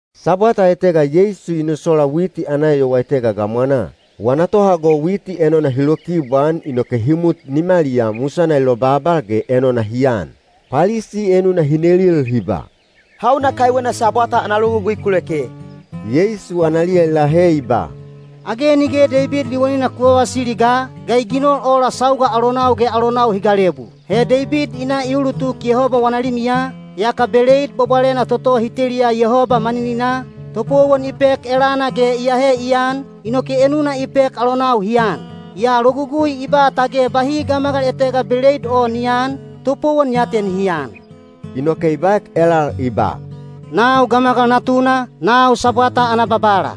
Sabwata etega Yeisu i nosola witi ana eyowa etega gamwanaa. Wana tohago witi enona hi lokibwaan inoke hi mut nimaliyaa musana i lobabal ge enona hi an. Palisi enuna hi nelil hi ba, “Hauna kaiwena Sabwata ana logugui ku leke?” Yeisu analiya i lahe i ba, “Age nige Deibid liwanina ku vavasili ga, ga i ginol ola sauga alonau ge alonau hi galebu? He Deibid i na i ulutuk Yehoba wana limiya, yaka beleid bwabwalena toto hi teliya Yehoba manininaa, topowon i pek elana ge i ahe i an, inoke enuna i pek alonau hi an. Yaa logugui i ba tage bahi gamagal etega beleid o ni aan, topowon ya te nihi an.” Inoke i baek elal i ba, “Nau Gamagal Natuna, nau Sabwata ana Babala.”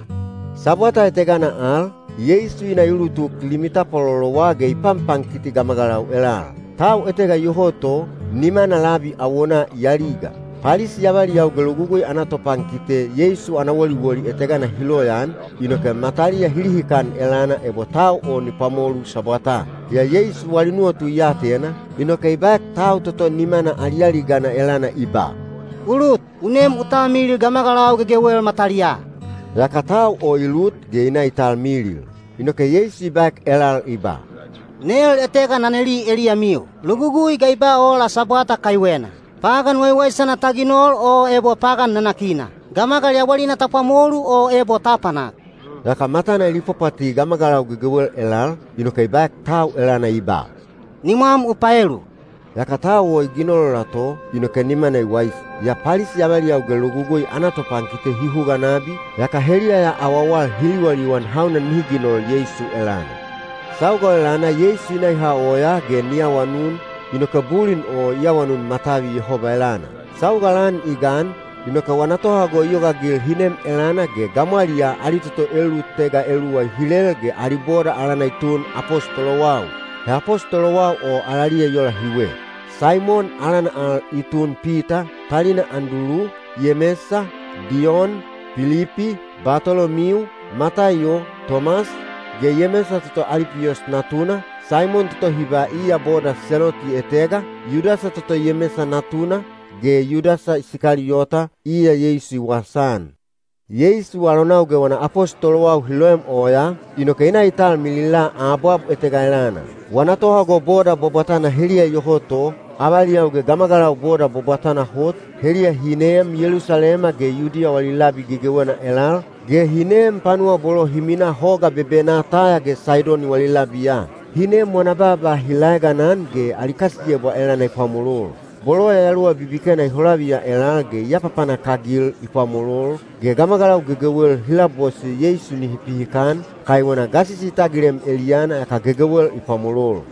Sabwata etegana al, Yeisu i na i ulutuk limi tapwalolowa ge i panpankiti gamagalau elal. Tau etega iyoho to, nimana labi awonaa i aliga. Palisi avaliyau ge logugui ana topankite Yeisu ana woliwoli etegana hi loyaan, inoke mataliya hi lihikan elana ebo tau o ni pwamolu Sabwataa. Yaa Yeisu wali nuwatu i atena, inoke i baek tau toto nimana alialigana elana i ba, “U lut, u nem u talmilil gamagalau gegewel mataliyaa.” Yaka tau o i lut ge i na i talmilil. Inoke Yeisu i baek elal i ba, “Nel etega na neli eliyamiu. Logugui ga i ba ola Sabwata kaiwena? Pagan waiwaisana ta ginol o ebo pagan nanakina? Gamagal yawalina ta pwamolu, o ebo ta apanak?” Yaka matana i lipwapwati gamagalau gegewel elal, inoke i baek tau elana i ba, “Nimwam u paelu.” Yaka tau o i ginol i ola to, inoke nimana i waisi. Yaa Palisi avaliyau ge logugui ana topankite hi huga nabi, yaka heliya ya awawal hi liwaliwan hauna nihi ginol Yeisu elana. Sauga o elana Yeisu i na i ha oyaa ge ni awanun, inoke bulin o i awanun matavi Yehoba elana. Sauga lan i gan, inoke wana tohago i yogaagil hi nem elana ge gamwaliyaa ali toto elulutega eluwa i hilel ge ali boda alana i tun apostolowau. He apostolowau o alaliya i ola hiwe: Saimon (alana al i tun Pita), talina Andulu, Yemesa, Diyon, Pilipi, Batolomiu, Mataiyo, Tomas, ge Yemesa toto Alipiyos natuna, Saimon toto hi ba iya boda Seloti etega, Yudasa toto Yemesa natuna, ge Yudasa Isikaliyota, iya Yeisu i wasaan. Yeisu alonau ge wana apostolowau hi loem oyaa, inoke i na i talmilila abwab etega elana. Wana tohago boda bwabwatana heliya iyoho to, avaliyau ge gamagalau boda bwabwatana hot, heliya hi neem Yelusalema ge Yudiya wali labi gegewena elal, ge hi neem panuwa bolo hi minaa hoga bebenaa Taya ge Saidoni wali labiya. Hi nem wana baaba hi laeganan ge ali kasiyebwa elana i pwamolol. Bolo yayaluwa bibikena i holaviya elal ge i apapanak-agil i pwamolol, ge gamagalau gegewel hi labose Yeisu nihi pihikan, kaiwena gasisi i tagilem eliyana yaka gegewel i pwamolol.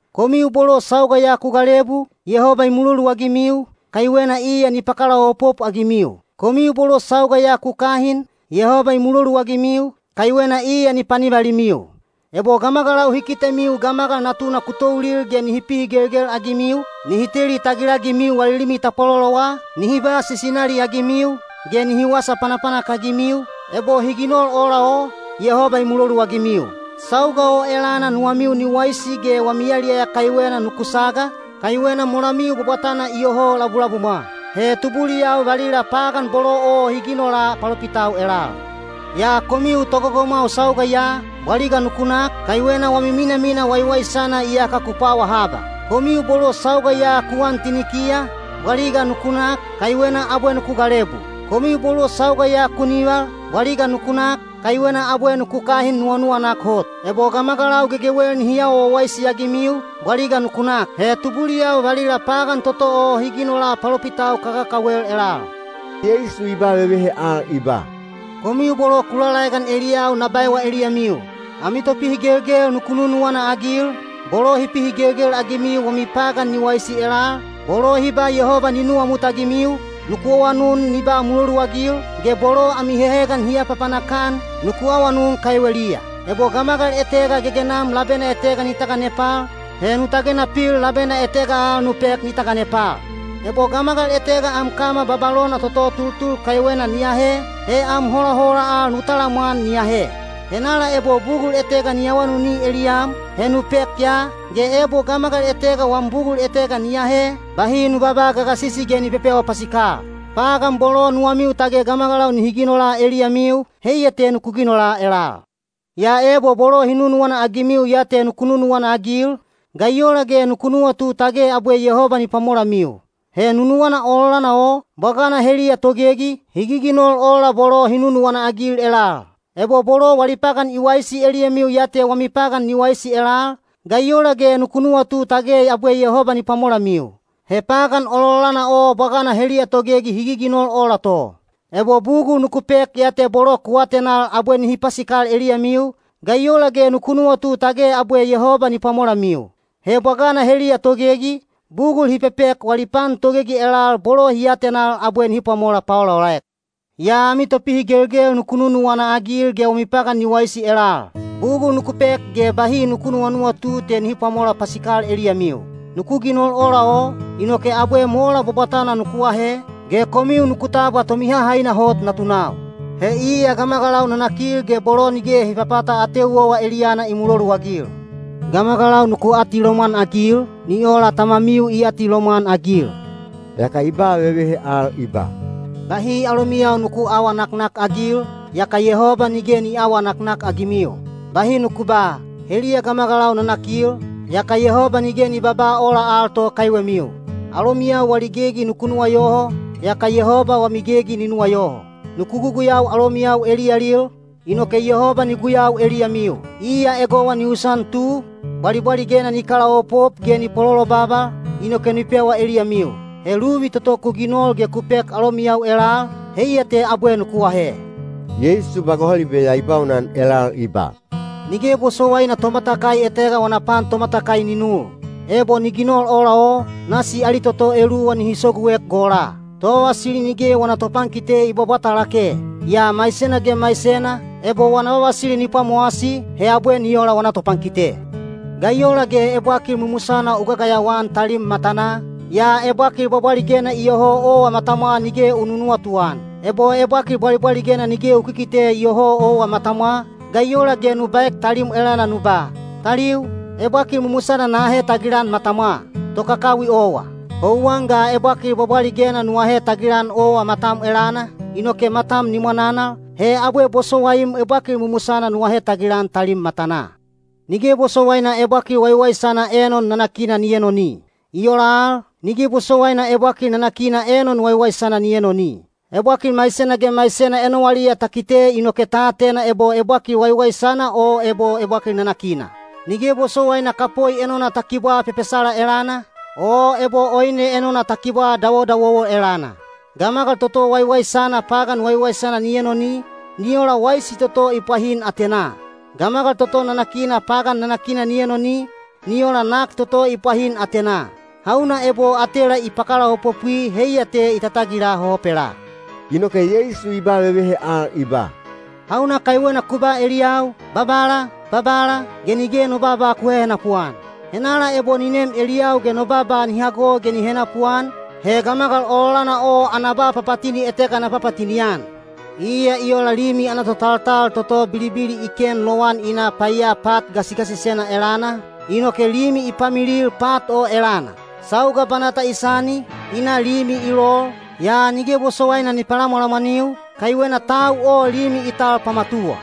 Komiu bolo sauga ya ku galebu, Yehoba i muloluagimiu, kaiwena iya ni pakalaopop-agimiu. Komiu bolo sauga ya ku kahin, Yehoba i muloluagimiu, kaiwena iya ni panivalimiu. Ebo gamagalau hi kitemiu Gamagal Natuna ku toulil ge nihi pihigelgel-agimiu, nihi teli tagilagimiu wali limi tapwalolowa, nihi ba sisinali-agimiu, ge nihi wasa panapanak-agimiu, ebo hi ginol ola o, Yehoba i muloluagimiu. Sauga o elana nuwamiu ni waisi ge wami yaliyaya kaiwena nuku saga, kaiwena molamiu bwabwatana iyoho labulabumwa. He tubuliyau valila pagan bolo o hi ginola palopitau elal. Yaa komiu togogomwau sauga ya, bwaliga nuku nak, kaiwena wami minamina waiwaisana iyaka ku pwawa haba. Komiu bolo sauga ya ku an tinikiya, bwaliga nuku nak, kaiwena abwe nuku galebu. Komiu bolo sauga ya ku nival, bwaliga nuku nak, kaiwena abwe nuku kahin nuwanuwanak hot. Ebo gamagalau gegewel nihi awa wawaisi-agimiu, bwaliga nuku nak. He tubuliyau valila pagan toto o hi ginola palopitau kakakawel elal. Yeisu i ba vevehe al i ba, “Komiu bolo ku lalaegan eliyau na baewa eliyamiu: ami topihigelgel nuku nunuwana-agil, bolo hi pihigelgel-agimiu wami pagan ni waisi elal, bolo hi ba Yehoba ni nuwamutagimiu, nuku awanun ni ba muloluagil, ge bolo ami hehegan hi apapanak-an, nuku awanun kaiweliya. Ebo gamagal etega gegenam labena etega ni taganepal, he nu tagena pil labena etega al nu pek ni taganepal. Ebo gamagal etega am kama babalona toto tultul kaiwena ni ahe, he am holahola al nu talamwan ni ahe. Henala ebo bugul etega ni awanuni eliyam, he nu pek ya, ge ebo gamagal etega wam bugul etega ni ahe, bahi nu babaa gagasisi ge ni pepewa pasikal. Pagan bolo nuwamiu tage gamagalau nihi ginola eliyamiu, heiya te nuku ginola elal. “Yaa ebo bolo hi nunuwana-agimiu ya te nuku nunuwana-agil, ga i ola ge nuku nuwatu tage abwe Yehoba ni pwamolamiu? He nunuwana ololana o, bwagana heliya togegi, hi giginol ola bolo hi nunuwana-agil elal. Ebo bolo wali pagan i waisi eliyamiu ya te wami pagan ni waisi elal, ga i ola ge nuku nuwatu tage abwe Yehoba ni pwamolamiu? He pagan ololana o bwagana heliya togegi hi giginol ola to. Ebo bugul nuku pek ya te bolo ku atenal abwe nihi pasikal eliyamiu, ga i ola ge nuku nuwatu tage abwe Yehoba ni pwamolamiu? He bwagana heliya togegi, bugul hi pepek wali pan togegi elal bolo hi atenal abwe nihi pwamola paolaolaek. Yaa ami topihigelgel nuku nunuwana-agil ge wami pagan ni waisi elal. Bugul nuku pek ge bahi nuku nuwanuwatu te nihi pwamola pasikal eliyamiu. Nuku ginol ola o, inoke abwe mola bwabwatana nuku ahe, ge komiu nuku tabwa Tomihahaina Hot natunau. He iya gamagalau nanakil ge bolo nige hi papata ateu owa eliyana i muloluagil. Gamagalau nuku atilomwan-agil, ni ola Tamamiu i atilomwan-agil.” Yaka i ba vevehe al i ba, “Bahi alomiyau nuku aawa naknakagil, yaka Yehoba nige ni aawa naknakagimiu. Bahi nuku ba, ‘Heliya gamagalau nanakil,’ yaka Yehoba nige ni babaa ola al to kaiwemiu. Alomiyau wali gegi nuku nuwayoho, yaka Yehoba wami gegi ni nuwayoho. Nuku guguyau alomiyau eliyalil, inoke Yehoba ni guyau eliyamiu. Iya egowa ni usan tu, bwalibwaligena ni kalaopop ge ni pololobabal, inoke ni pewa eliyamiu. He luvi toto ku ginol ge ku pek alomiyau elal, heiya te abwe nuku ahe.” Yeisu ba gohalibe ya i baunan elal i ba, “Nige bosowaina tomatakai etega wana pan tomatakai ni nul. Ebo ni ginol ola o, nasi ali toto eluwa nihi soguek gola. Tovavasili nige wana topankite i bwabwata lake. Yaa maisena ge maisena, ebo wana vavasili ni pwamowasi, he abwe ni ola wana topankite. “Ga i ola ge ebwakil mumusana u gagayawa-an talim matanaa, yaa ebwakil bwabwaligena iyoho owa matamwa nige u nunuwatu-an? Ebo ebwakil bwabwaligena nige u kikite iyoho owa matamwa, ga i ola ge nu baek talim elana nu ba, ‘Taliu, ebwakil mumusana na ahe tagilan matamwa.’ Tokakawi owa! Houwan ga ebwakil bwabwaligena nu ahe tagilan owa matam elana, inoke matam ni mwananal, he abwe bosowaim ebwakil mumusana nu ahe tagilan talim matanaa.” “Nige bosowaina ebwakil waiwaisana enon nanakina ni enoni. I ola al, nige bosowaina ebwakil nanakina enon waiwaisana ni enoni. Ebwakil maisena ge maisena enowaliya ta kite inoke ta atena ebo ebwakil waiwaisana o ebo ebwakil nanakina. Nige bosowaina kapoi enona ta kibwaa pepesala elana, o ebo oine enona ta kibwaa dawodawowo elana. Gamagal toto waiwaisana pagan waiwaisana ni enoni, ni ola waisi toto i pwahin atenaa. Gamagal toto nanakina pagan nanakina ni enoni, ni ola nak toto i pwahin atenaa. Hauna ebo atela i pakalaopopwi heiya te i tatagila hohopelaa.” Inoke Yeisu i ba vevehe al i ba, “Hauna kaiwena ku ba eliyau, ‘Babala, Babala,’ ge nige no baaba ku hehenapu-an? Henala ebo ni nem eliyau ge no baaba ni hago ge ni henapuan, he gamagal ololana o ana ba papatini etega na papatini-an. Iya i ola limi ana totaltal toto bilibili i ken lowan i na paiya pat gasigasisena elana, inoke limi i pamilil pat o elana. Sauga banata i sani, i na limi i lol, yaa nige bosowaina ni palamwalamwaniu, kaiwena tau o limi i tal pamatuwa.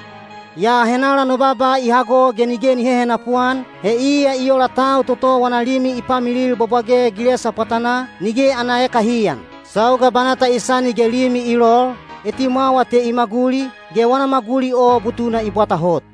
Yaa henala no baaba i hago ge nige ni hehenapu-an, he iya i ola tau toto wana limi i pamilil bwabwage gilesa pwatanaa, nige ana ekahiyan. Sauga banata i sani ge limi i lol, etimwawa te i maguli, ge wana maguli o butuna i bwata hot.”